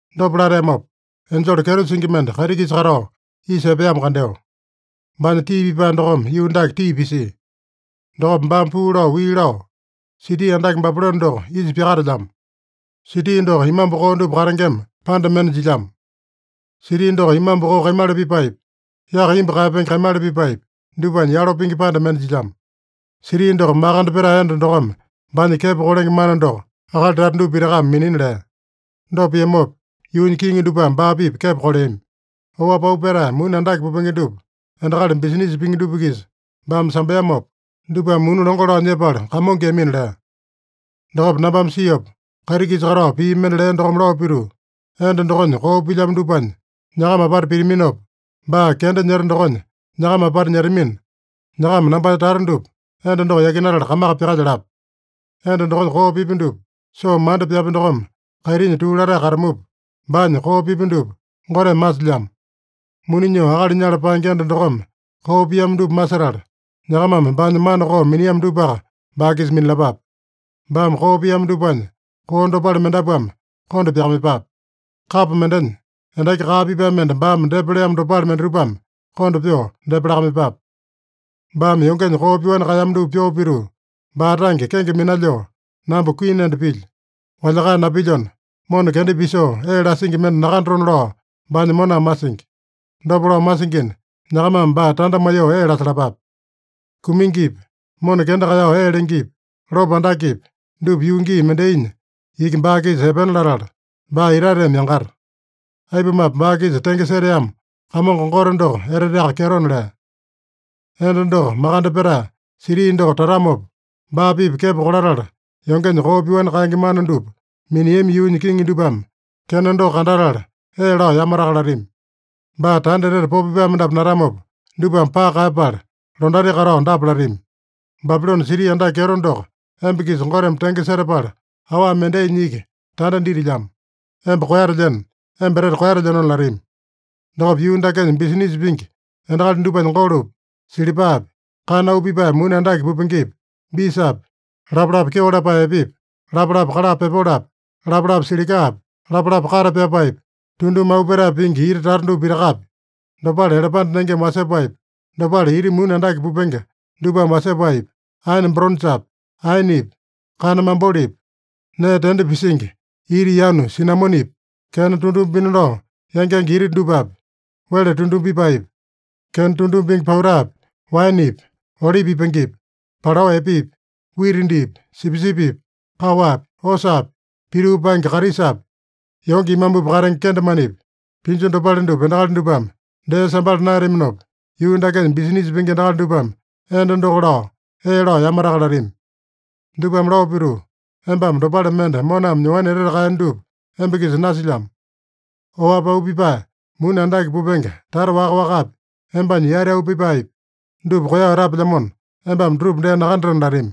Dopa lateamopa, enjele kyeto singi mende kaiti-kisa katao isa epeamo kandeo. Baanya tii pipae dokome yuu dake tii pisia. Dokopa baame puu lao wii lao, “Siti andake Babilone doko isa pyakatelyamo. Siti doko imambu koo dupa katengema panda mende jilyamo. Siti doko imambu koo kaimala pipaepi, yaka imbu kaeyapenge kaimala pipaepi, dupanya yalo pingi panda mende jilyamo. Siti doko makande petae enda dokome baanya kepo kolenge mana doko akali tata dupa pitakame minina lea. Dopa piamopa, yuunya kiŋi dupame baa-pipa kepo koleami. Oapi auu petae muni andake pupenge dupa endakali bisinisa pingi dupa-kisa baame sambeamopa, dupame muni longo lao nyepala kamongoeyamina” lea. Dokopa nambame siopa, kaiti-kisa katao pii mende lea dokome lao pituu, “Enda dokonya koo pilyamo dupanya nyakama apata pitaminopa, baa kenda nyeta dokonya nyakama apata nyetamina, nyakama nambanya tata dupa enda doko yakinatala kamaka pyakalyalapa. Enda dokonya koo pipya dupa soo manda pyapya dokome kaitinya tuu latae katamupa, baanya koo pipya dupa Goteme masilyamo. Muni nyoo akali nyala paenge enda dokome koo piamo dupa masetala, nyakamame baanya mana koo miniamo dupaka baa-kisa minalapape. Baame koo piamo dupanya koo dopale mendapuame konda pyakamaiyepape. Kapo mendenya endaki kaa pipae mende baame depa leamo dopale mendatupame konda pyoo depa lakamaiyepape. Baame yongenya koo pyoani kaeyamo dupa pyoo pituu, baa tange kenge minalyoo, ‘Namba kuini enda pilyo. Walyakae napilyona, mona kenda pisoo ee lasingi mende nakandatona’ lao baanya moname masingi. Dopa lao masingina, nyakamame baa tanda maiyoo ee lasalapape. Kumingipi, mona kenda kaeyao ee lengepi, lopo andakepi, dupa yuu gii mendainya iki baa-kisa epena latala, baa itateme yangata. Aipumape, baa-kisa tenge seteamo Kamongo Gote doko eteteaka kyetona” lea. Enda doko makande petae siti doko tatamopa, baa-pipa kepo kolatala yongenya koo pyoani kaenge mana dupa miniami yuunya kiŋi dupame kena doko kandatala, ee lao yamataka latami. Baa tanda etete popo pipae mendapu natamopa, dupame paka kaeyapala londati katao dapa latami: “Babilone siti andake kyeto doko, emba-kisa Goteme tenge setapala, awa mendainya iki tanda ditilyamo. Emba koeyatelyeno. Emba etete koeyatelyenona” latami. Dokopa yuu dakenya bisinisa pingi endakali dupanya golopi, silipapi, kana auu pipae muni andake pupengepi, bisapi, lapalapa kyeo lapae epepi, lapalapa kala pepolopi, lapalapa silikapi, lapalapa kate pyapaepi, tunduma auu petae pingi ita tata dupa pitakapi, dopale elepande nengeme wasepaepi, dopale ita muni andake pupenge dupame wasepaepi, aene boronjapi, aenepi, kana mabolepi, nee tende pisingi ita yanu sinamonepi, kena tunduma pina lao yangenge ita dupapi, wele tunduma pipaepi, kena tunduma pingi pautapi, waenepi, olipi ipangepi, palao epepi, wita diipi, sipisipipi, kaowapi, osapi, pituu paenge karisapi, yonge imambupi katenge kendemanepi, pinju dopale dupa endakali dupame dee sambala naeyataminopa, yuu dakenya bisinisa pingi endakali dupame enda doko lao ee lao yamataka latami. Dupame lao pituu, “Embame dopale mende moname nyoani etete kaeyeno dupa emba-kisa nasilyamo. Oapi auu pipae muni andake pupenge tata waka-wakapi, embanya yati auu pipaepi, dupa koeyao etapelyamona, embame dutupa dee nakandatena” latami.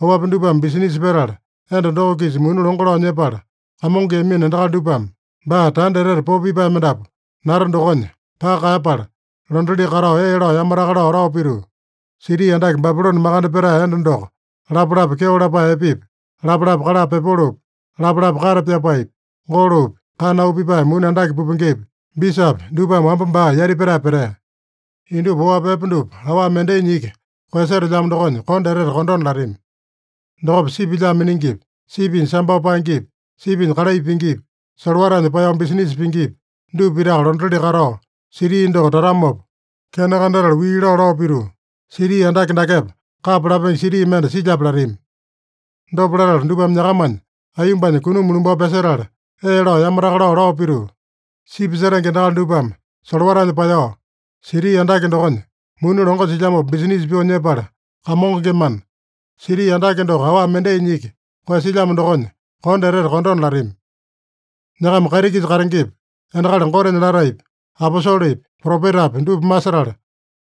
Oapi dupame bisinisa petala enda doko-kisa muni longo lao nyepala kamongoeyamino endakali dupame, baa tanda etete popo pipae mendapu nata dokonya paka kaeyapala, londatili katao ee lao yamataka lao, lao pituu, “Siti andake Babilone makande petae enda doko lapalapa kyeo lapae epepi, lapalapa kala pepolopi, lapalapa kate pyapaepi, golopi, kana auu pipae muni andake pupengepi, bisapi, dupame wamba baa yati petae petea. Indupa oapi epe dupa awa mendainya iki koeyasetelyamo dokonya kondo, etete kondona” latami. Dokopa sipi lyaa miningipi, sipinya sambao paengepi, sipinya kalai pingipi, solowatanya paeyao bisinisa pingipi, dupa pitaka londatili katao, siti doko tatamopa kena kandatala wii lao, lao pituu, “Siti andake dakepa kapa lapenge siti mende silyape?” latami. Dopa latala dupame nyakamanya aiyombanya kunuma lumbao pyasetala, ee lao yamataka lao, lao pituu, “Sipi setenge endakali dupame solowatanya paeyao, siti andake dokonya muni longo silyamopa bisinisa pyoo nyepala kamongengemana, siti andake doko awa mendainya iki koeyasilyamo dokonya kondo, etete kondona” latami. Nyakama kaiti-kisa katengepi, endakali Gotenya lataepi, aposolepi, propetapi dupa masetala,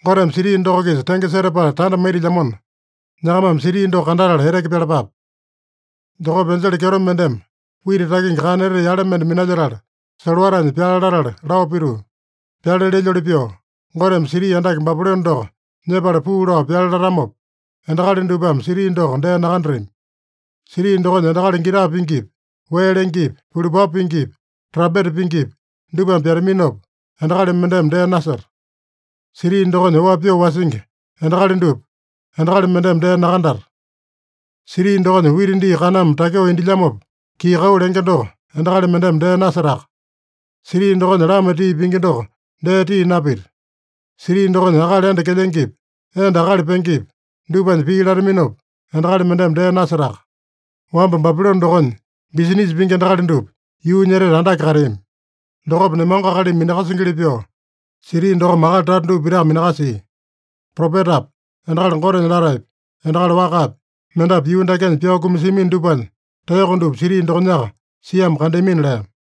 Goteme siti doko-kisa tenge setapala tanda maitilyamona, nyakamame siti doko kandatala eteke pyalapape. Dokopa enjele kyeto mendeme wita takingi kana etete yale mende minalyetala, solowatanya pyale latala lao pituu, “Pyale lelyoli pyoo, Goteme siti andake Babilone doko nyepala puu lao pyale latamopa, endakali dupame siti doko dee nakandatami. Siti dokonya endakali gita pingipi, wee lengepi, pulupapu pingipi, trampeta pingipi, dupame pyataminopa, endakali mendeme dee naseta. Siti dokonya oapi pyoo wasingi endakali dupa, endakali mendeme dee nakandata. Siti dokonya wita dii kaname takyoo indilyamopa kii-kau lenge doko, endakali mendeme dee nasetaka. Siti dokonya lama tii pingi doko dee tii napita. Siti dokonya akali enda kelyengepi, enda akali pengepi, dupanya pii lataminopa, endakali mendeme dee nasetaka. Wamba Babilone dokonya bisinisa pingi endakali dupa yuunya etete andake kateami. Dokopa nemango akalimi minakasingili pyoo, siti dokome akali tata dupa pitaka minakasia. Propetapi, endakali Gotenya lataepi, endakali wakapi, mendapu yuu dakenya pyao kumasiamino dupanya taeyoko dupa siti dokonyaka siamo kandeamina” lea.